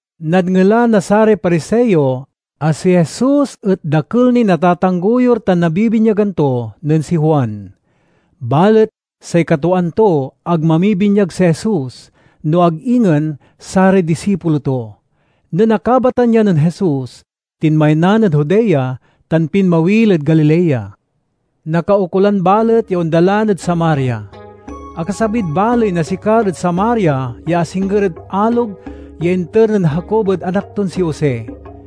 Nadngelan na saray Pariseo a si Jesus et dakel niy natatanggoyur tan nabibinyagan to nen si Juan. (Balet say katwaan to ag mamibinyag si Jesus, no ag ingen saray disipulo to.) Nen akabatan ya nen Jesus, tinmaynan ed Judea tan pinmawil ed Galilea. Nakaukolan balet ya ondalan ed Samaria. Akasabid baley na Sicar ed Samaria ya asingger ed alog ya inter nen Jacob ed anak ton si Jose.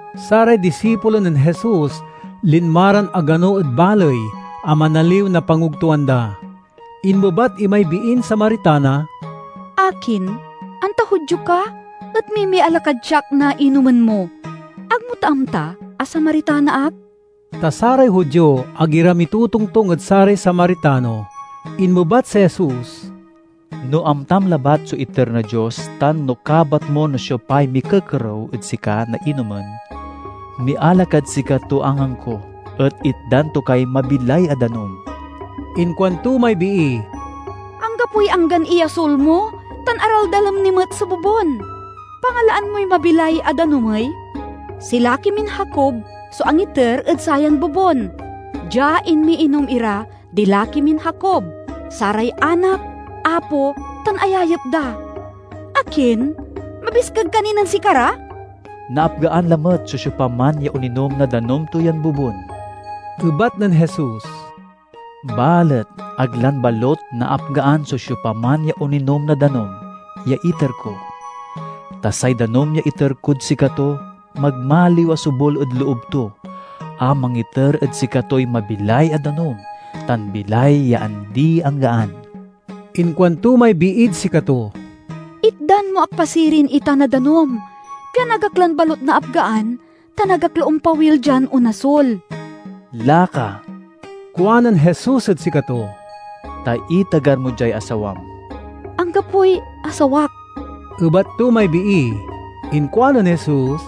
(Saray disipulo nen Jesus linma ran agano ed baley a manaliw na pangogtoan da.) Inmebat imay biin Samaritana, "Akin, anta Judio ka et mimiala kad siak na inomin mo? Ag mo ta amta a Samaritana ak?" (Ta saray Judio ag ira mitotongtong ed saray Samaritano.) Inmebat si Jesus, "No amtam labat so iter na Dios tan no kabat mo no siopay mikekerew ed sika na inomin, miala kad sikato angangko et itdan to kay mabilay a danum." Inkuanto may bii, "Anggapoy anggan iyasul mo tan araldalem ni met so bobun. Pangalaan moy mabilay a danum ey? Si laki min Jacob so angiter ed sayan bobun. Dia inmiinom ira di laki min Jacob, saray anak, apo, tan ayayep da. Akin, mabiskeg ka ni nen sikara?" "Naapgaan lamet so siopaman ya oninom na danum to yan bobun," ebat nen Jesus, "balet ag lan balut naapgaan so siopaman ya oninom na danum, ya iter ko. Ta say danum ya iter kod sikato magmaliw a sobul ed loob to a mangiter ed sikatoy mabilay a danum tan bilay ya andi-anggaan." Inkuanto may biid sikato, "Itdan mo ak pa sirin itan a danum, pian ag ak lan balut naapgaan tan ag ak la ompawil dian onasul." "Laka," kuanen Jesus ed sikato, "ta itagar mo diay asawam." "Anggapoy asawak," ebat to may bii. Inkuanen Jesus,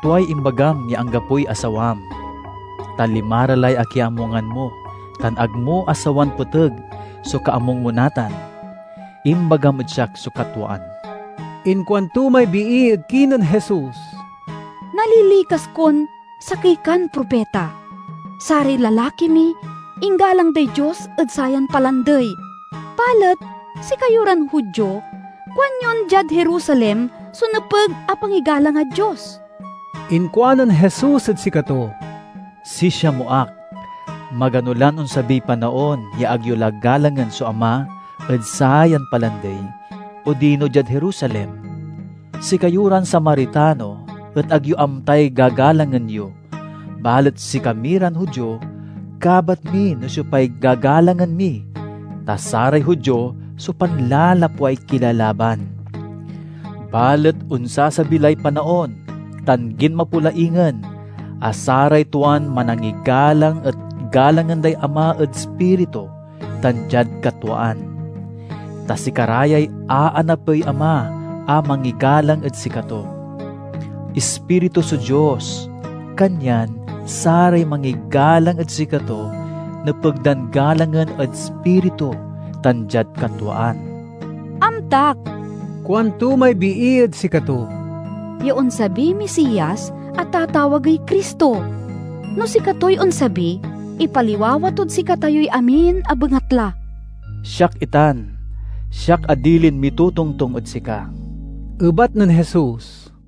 "Tuay imbagam ya anggapoy asawam. Ta limara lay akiamungan mo tan ag mo asawan peteg so kaamung mo natan. Imbagam ed siak so katwaan." Inkuanto may bii ed kinen Jesus, "Nalilikas kon sakey kan propita. Saray lalaki mi inggalang day Dios ed sayan palandey; balet sikayo ran Judio kuanyon diad Jerusalem so nepeg a pangigalangad Dios." Inkuanen Jesus ed sikato, "Sisia mo ak, magano lan onsabiy panaon ya ag yo la galangen so Ama ed sayan palandey odino diad Jerusalem. Sikayo ran Samaritano et ag yo amtay gagalangen yo, balet sikami ran Judio kabat mi no siopay gagalangen mi, ta saray Judio so panlalapway kilalaban. Balet onsasabi lay panaon, tan ginmapo la ingen, a saray tuan manangigalang et galangen day Ama ed ispiritu tan diad katwaan. Ta sikara yay aanapey Ama a mangigalang ed sikato. Ispiritu so Dios, kanyan saray mangigalang ed sikato nepeg dan galangen ed ispiritu tan diad katwaan." "Amtak," kuanto may bii ed sikato, "ya onsabiy Misias a tatawagey Cristo. No sikatoy onsabi, ipaliwawa tod sikatayoy amin a bengatla." "Siak itan, siak a dilin mitotongtong ed sika," ebat nen Jesus.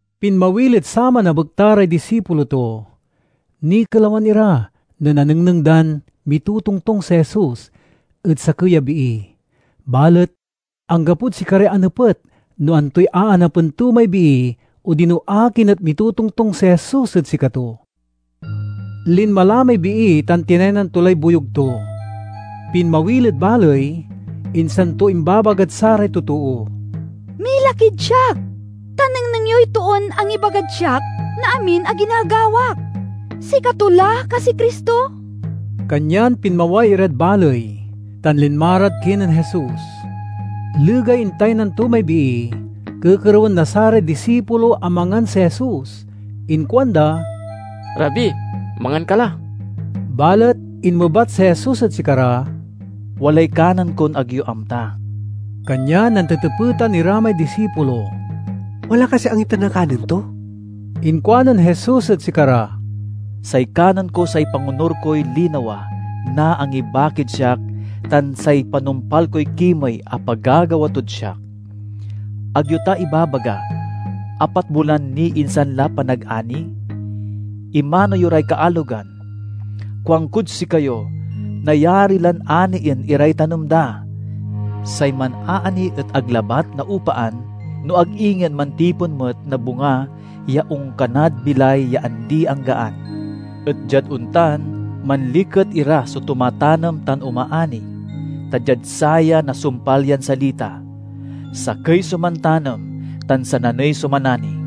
Pinmawil ed saman a bekta ray disipulo to. Nikelawan ira nen anengneng dan mitotongtong si Jesus ed sakey a bii, balet anggapod sikaray anepet no antoy aanapen to may bii odino akin et mitotongtong si Jesus ed sikato. Linma la may bii tan tinaynan to lay boyug to. Pinmawil ed baley, insan to imbabagad saray totoo, "Mila kid siak, ta nengneng yoy toon angibagad siak na amin a ginagawak. Sikato la kasiy Cristo?" Kanyan pinmaway irad baley, tan linma rad kinen Jesus. Legay intaynan to may bii, kekerewen na saray disipulo a mangan si Jesus. Inkuanda, "Rabi, mangan ka la!" Balet inmebat si Jesus ed sikara, "Walay kanen kon ag yo amta." Kanyan nantetepetan ira may disipulo, "Wala kasiy angiter na kanen to?" Inkuanen Jesus ed sikara, "Say kanen ko say pangonur koy linawa na angibakid siak tan say panumpal koy kimey a pagagawa tod siak. Ag yo ta ibabaga, 'Apat bulan ni insan la panagani'? Imano yo ray kaalogan. Kuankod sikayo, nayari lan anien iray tanem da! Say manaani et ag labat naopaan no ag ingen mantipon met na bunga ya onkanad bilay ya andi-anggaan, et diad ontan, manliket iran so tumatanem tan omaani. Ta diad saya nasumpal yan salita: 'Sakey so mantanem, tan sananey so manani.'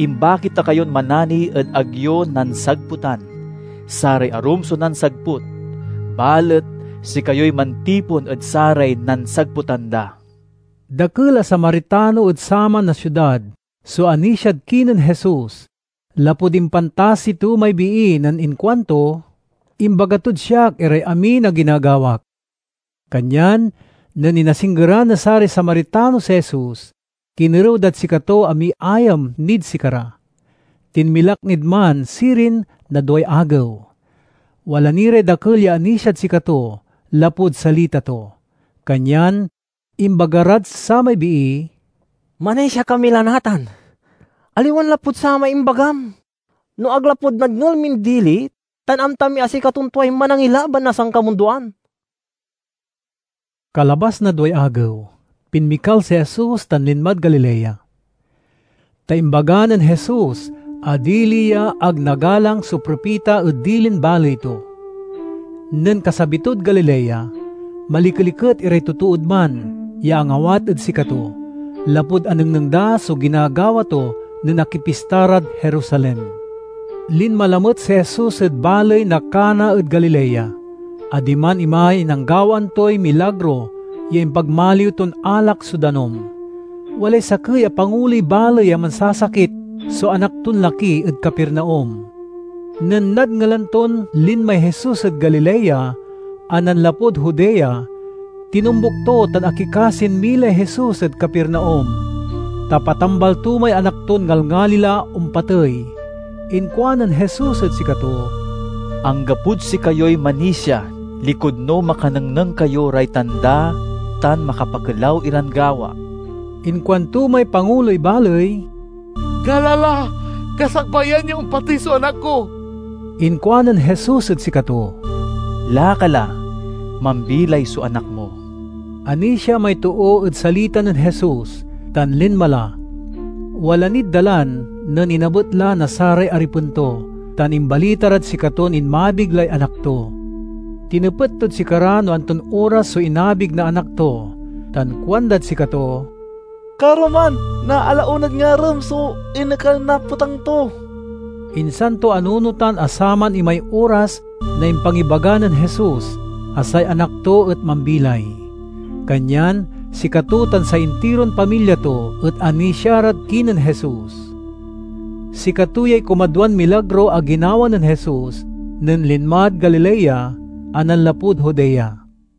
Imbaki ta kayon manani ed ag yo nansagputan; saray arum so nansagput, balet sikayoy mantipon ed saray nansagputan da." Dakel a Samaritano ed saman a siudad so anisiad kinen Jesus lapud impantasi to may bii nen inkuanto, "Imbaga tod siak iray amin a ginagawak." Kanyan nen inasinggeran na saray Samaritano si Jesus, kinerew dad sikato a miayam nid sikara. Tinmilak nid man sirin na duay agew. Wala ni ray dakel ya anisiad sikato lapud salita to. Kanyan imbaga rad samay bii, "Manisia kami la natan, aliwan lapud samay imbagam, no ag lapud nadngel min dili; tan amta mi a sikaton tuay Manangilaban na sankamundoan." Kalabas na duay agew, pinmikal si Jesus tan linmad Galilea. Ta imbaga nen Jesus a dili ya ag nagalang so propita ed dilin baley to. Nen kasabi tod Galilea, malikeliket iray totood man ya angawat ed sikato lapud anengneng da so ginagawa to nen akipista rad Jerusalem. Linma lamet si Jesus ed baley na Cana ed Galilea, a diman imay nanggawaan toy milagro ya impagmaliw ton alak so danum. Walay sakey a panguloy baley a mansasakit so anak ton laki ed Capernaum. Nen nadngelan ton linmay Jesus ed Galilea a nanlapud Judea, tinombuk to tan akikasin milay Jesus ed Capernaum, ta patambal to may anak ton ngalngali la ompatey. Inkuanen Jesus ed sikato, "Anggapod sikayoy manisia likud no makanengneng kayo ray tanda tan makapakelaw iran gawa." Inkuanto may panguloy baley, "Gala la, kasakbayan ya ompatey so anak ko." Inkuanen Jesus ed sikato, "Laka la; mambilay so anak mo!" Anisia may too ed salita nen Jesus, tan linma la. Wala nid dalan nen inabet la na saray aripen to tan imbalita rad sikaton inmabig lay anak to. Tinepet tod sikara no anton oras so inabig na anak to tan kuandad sikato, "Karoman na ala onad ngarem so inekal na petang to." Insan to anunotan a saman imay oras na impangibaga nen Jesus a say anak to et mambilay. Kanyan sikato tan say intiron pamilya to et anisia rad kinen Jesus. Sikato yay kumadwan milagro a ginawa nen Jesus nen linmad Galilea a nanlapud Judea.